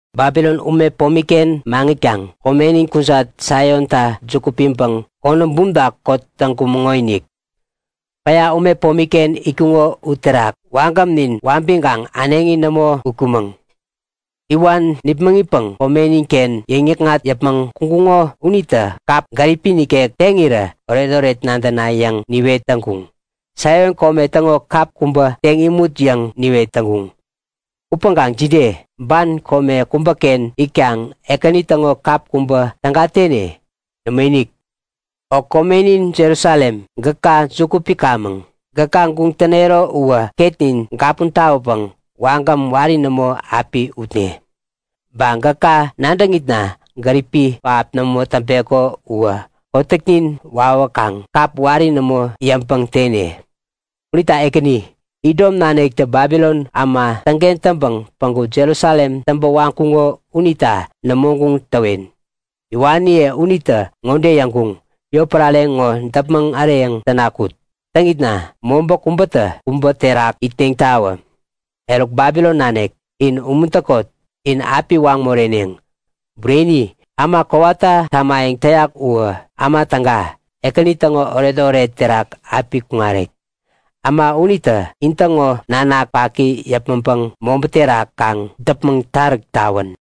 Babilon ume pomiken maŋitkaŋ komenin kujat Saionta juku piŋpäŋ konäm bumta kot täŋkumäŋonik. Päya ume pomiken itkuŋo u terak wagämnin wabiŋkaŋ äneŋi nämo utkumäŋ. Iwan nipmäŋitpäŋ komeniken yäŋnikŋat yäpmäŋ kuŋkuŋo unitä kap gäripi nikek teŋirä oretoret nadäna yäŋ niwet täŋkuŋ. Saion kome täŋo kap kubä teŋ nimut yäŋ niwet täŋkuŋ. Upäŋkaŋ jide? Ban kome kubäken itkaŋ Ekäni täŋo kap kubä täga tene? Nämoinik! O komenin Jerusalem, gäka juku pikamäŋ. Gäka guŋ tänero uwä ketnin gapun tawäpäŋ wagäm wari nämo api utne! Ba gäka nadäŋitna gäripi pähap nämo täŋpeko uwä kotäknin wawäkaŋ kap wari nämo yäŋpäŋ tene! Unita Ekäni, Idom naniktä Babilon äma täŋken täŋpäŋ päŋku Jerusalem täŋpä waŋkuŋo unita nämo guŋ täwen. Iwaniye unitä ŋode yäŋkuŋ; Yotpärare ŋo däpmäŋ äreyäŋ täna kut! Täŋitna mobä kubätä kubä terak itneŋtawä! Eruk Babilon nanik, in umuntäkot! In api waŋ moreneŋ. Bureni, äma kowata tamayäŋ täyak uwä äma täga, Ekäni täŋo oretoret terak api kuŋarek. Äma unitä intäŋo nanak paki yäpmäŋpäŋ mobä terak kaŋ däpmäŋtaräk tawän!